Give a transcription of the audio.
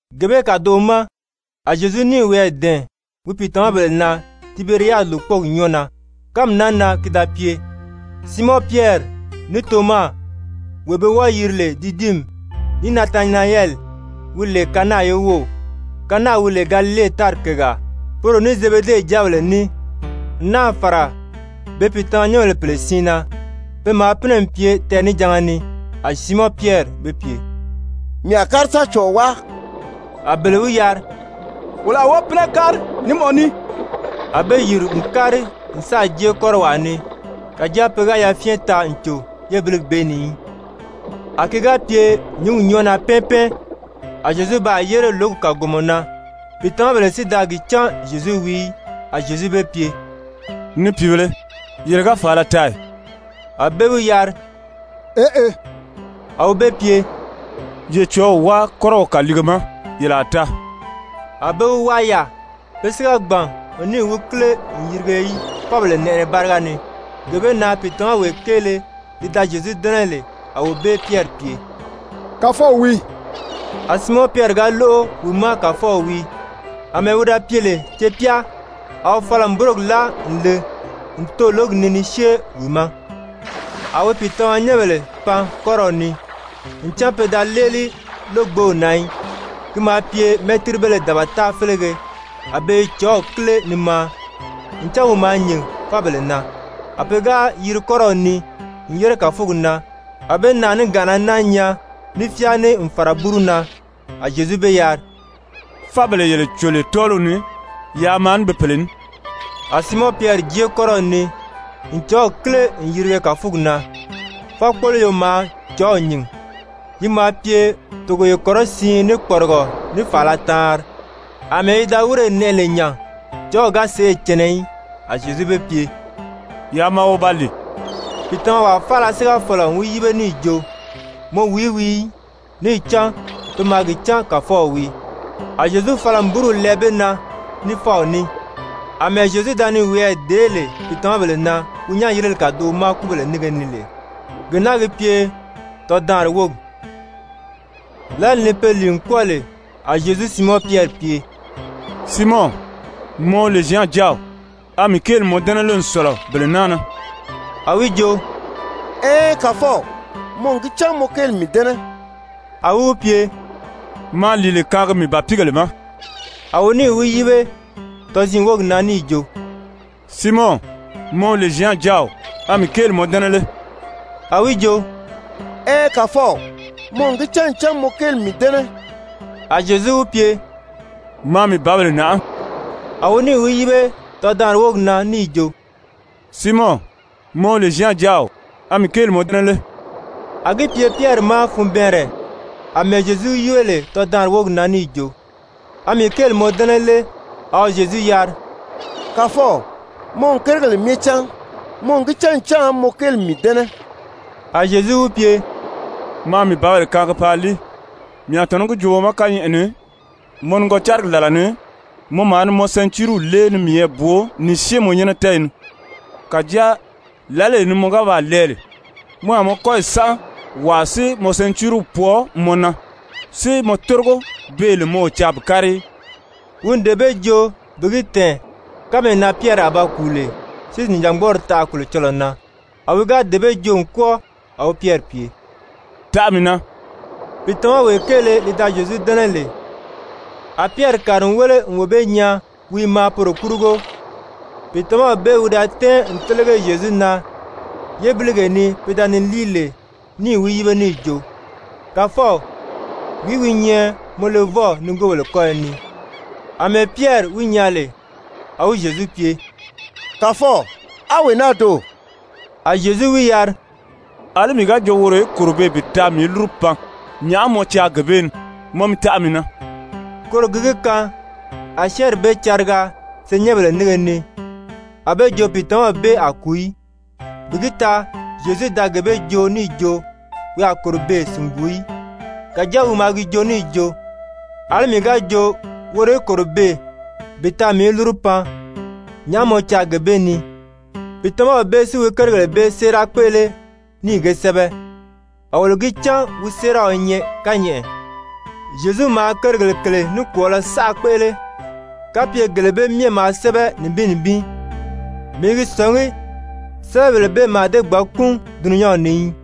Gee bee kàdoʔo ma a Zyezu níì wiyɛɛ dɛ̀ɛn wi pìitamabèle na Tiberiyadi lòkpɔɔgi nyɔ́ɔ na. Kánmi naa na ki da pye, Siimɔn Pyɛri, ní Toma, wee be wɔ́ɔ̄ yiri lè Didimi, ní Natanayɛli, wi lè Kana ye wów, Kana wi lè Galile tári kègaa, poro ní Zebede jáabèle ní, n náà fàra be pìitamanyɛnbèle pèle siin na, pe maa pínɛ n pye tɛɛnijanga ni. A Siimɔn Pyɛri be pye: «Mii a kári sa cɔ̀ɔ wáa.» A bele wi yari: «Wolo a wɔ́ɔ pínɛ kári ní mɔ ní.» A be yìri n kári n sáà jée kɔ́rɔwaa ni, kàjáa pe ga yafyɛn taa n cò yébiligi bee ni í. A ki ga pye nyǐngi nyɔ́ɔ na pɛ́ɛn pɛ́ɛn, a Zyezu baa yére lǒgi kàgomɔ na, pìitamabèle si da gi cán Zyezu wii í. A Zyezu be pye: «Ni pìibēle, yele ga fàala taa ì?» A be wi yari: «Eʔe.» A wi be pye: «Ye cɔ̀ɔ́w wáa kɔ́rɔw kàliige ma, yele a taa.» A be wi wáa yaà. Pe si ga gbàn n níì wi kíle n yirige í fábèle nɛʔɛnɛ báriga ni. Gee bee na pìitamawee kéele li da Zyezu dɛ́nɛ lè, a wee bee Pyɛri pye: «Kàfɔw wii!» A Siimɔn Pyɛri ga lóʔo wi ma Kàfɔw wii, àmɛɛ wi da pye lè cepyá, a wi fala n búrogi láa n le n too lǒgi ni ni syée wi ma. A wi pìitamanyɛnbèle pan kɔ́rɔw ni, ncan pe da léeli lógbew na í, ki maa pye mɛ́tiribéle dabata félege, a be i cɔ̀ɔ́w kíle ni maa, ncan wi maa nyìn fábèle na. A pe ga yiri kɔ́rɔw ni n yére kàfugi na, a be naàniganʔana náa nyaa ní fyáā ní n fàra búru na. A Zyezu be yari: «Fábèle yele cò lè tɔ́ɔliw ni, yaa maa ní be pèle ní.» A Siimɔn Pyɛri jée kɔ́rɔw ni n cɔ̀ɔ́w kíle n yirige kàfugi na, fákpoloyo maa cɔ̀ɔ́w nyìn, yi maa pye togoye kɔrɔsiin ní kpɔrigɔ ní fàala taanri. Amɛɛ yi da wírè nɛʔɛ lè nya, cɔ̀ɔ́w ga sèʔê cɛnɛ í. A Zyezu be pye: «Yaa maa wo ba lìi.» Pìitamawaa faala si ga fɔ̀lɔ n wi yíbe níì jo: «Mɔ wìí wii» í. Níì cán pe maa gi cán Kàfɔw wii. A Zyezu fala n búruw lɛɛ be na ní fáw ní. Amɛɛ Zyezu da ni wiyɛɛ dèé lè pìitamabèle na wi nyán-yirili kàdoʔo ma kúbèle nínge ni lè, gee naa gi pye tɔdaanri wógi. Lǎli ni pe lìi n kwɔ́ɔ lè, a Zyezu Siimɔn Pyɛri pye: «Siimɔn, mɔ wi lè Zyan jáaw, a mii kéeli mɔ dɛ́nɛ lé n sɔ̀lɔ bele naa na?» A wi jo: «Ɛɛn, Kàfɔw, mɔ n gi cán mɔ kéeli n mii dɛ́nɛ.» A wi wi pye: «Maa lìile kaangi mii bàpiigèle ma.» A wi níì wi yíbe tɔziin wógi na níì jo: «Siimɔn, mɔ wi lè Zyan jáaw, a mii kéeli mɔ dɛ́nɛ lé?» A wi jo: «Ɛɛn, Kàfɔw, mɔ n gi cán ncan mɔ kéeli n mii dɛ́nɛ.» A Zyezu wi pye: «Maa mii bǎbèle nàʔá.» A wi níì wi yíbe tɔdaanri wógi na níì jo: «Siimɔn, mɔ wi lè Zyan jáaw, a mii kéeli mɔ dɛ́nɛ lé?» A gi pye Pyɛri ma funbɛɛnrɛ àmɛɛ Zyezu wi yíbe lè tɔdaanri wógi na níì jo: «A mii kéeli mɔ dɛ́nɛ lé?» A wi Zyezu yari: «Kàfɔw, mɔ n kérigèle myɛ cán. Mɔ n gi cán ncan mɔ kéeli n mii dɛ́nɛ.» A Zyezu wi pye: «Maa mii bǎbèle kaangi paa líi. Mii a tɔ̀nɔ́ gi joo mɔ ma kányɛʔɛ ni, mɔ nigɔcarigi làla ni mɔ maa ni mɔ sɛntiiriw lée ni miyɛɛ bwoo ni syée mɔ nyɛ́nɛ tɛ́ɛyi ni. Kàjáa lǎlee ni mɔ ga baa lɛɛ lè, mɔ a mɔ kɔ́yi sánʔa, wàa si mɔ sɛntiiriw pwɔɔ mɔ na si mɔ tórigo beè lè mɔ o caa bi kári í.» Wi n dee bee joo bi gi tɛ̀ɛn kánmee na Pyɛri a ba kùu lè si nìjangbɔɔri taʔa Kolocɔlɔɔ na. A wi ga dee bee joo n kwɔ́ɔ, a wi Pyɛri pye: «Taʔa mii na.» Pìitamawee kéele li da Zyezu dɛ́nɛ lè, a Pyɛri kàri n wéle n wee bee nyaa wi i maa poro kurugo, pìitamaw bee wi da tɛ́ɛn n télege Zyezu na yébiligee ni pe da ni líi lè níì wi yíbe níì jo: «Kàfɔw, wìí wi nyɛ mɔ levɔw nigoobèle kɔ́yɔ ni?» Amɛɛ Pyɛri wi nyaa lè, a wi Zyezu pye: «Kàfɔw, a wee naa doò?» A Zyezu wi yari: «Alí mii ga jo woro í kòro beè bi taa mii í lúru pan, nyàʔá mɔ caa gee bee ni? Mɔ mi taʔa mii na.» Koro gi gi kaan a syɛ́ɛnri bee cariga senyɛnbèle nínge ni, a be jo pìitamaw bee a kùu í. Bi gi taa Zyezu da gee bee joo níì jo wi a kòro beè sìnguu í, kàjáa wi maa gi joo níì jo: «Alí mii ga jo woro í kòro beè bi taa mii í lúru pan, nyàʔá mɔ caa gee bee ni?» Pìitamaw bee si wi kérigèle bee séera kpéʔele níì ge sɛ́bɛ. A wolo gi cán wi séeraw i nyɛ kányɛʔɛ. Zyezu maa kérigèle kèle nikwɔɔlɔ saʔa kpéʔele. Kapye gele bee myɛ maa sɛ́bɛ nibin nibin, mii i gi sɔ̀ngí sɛ́bɛbèle bee mǎà dée gbǎn kúun dulunyanw ni í.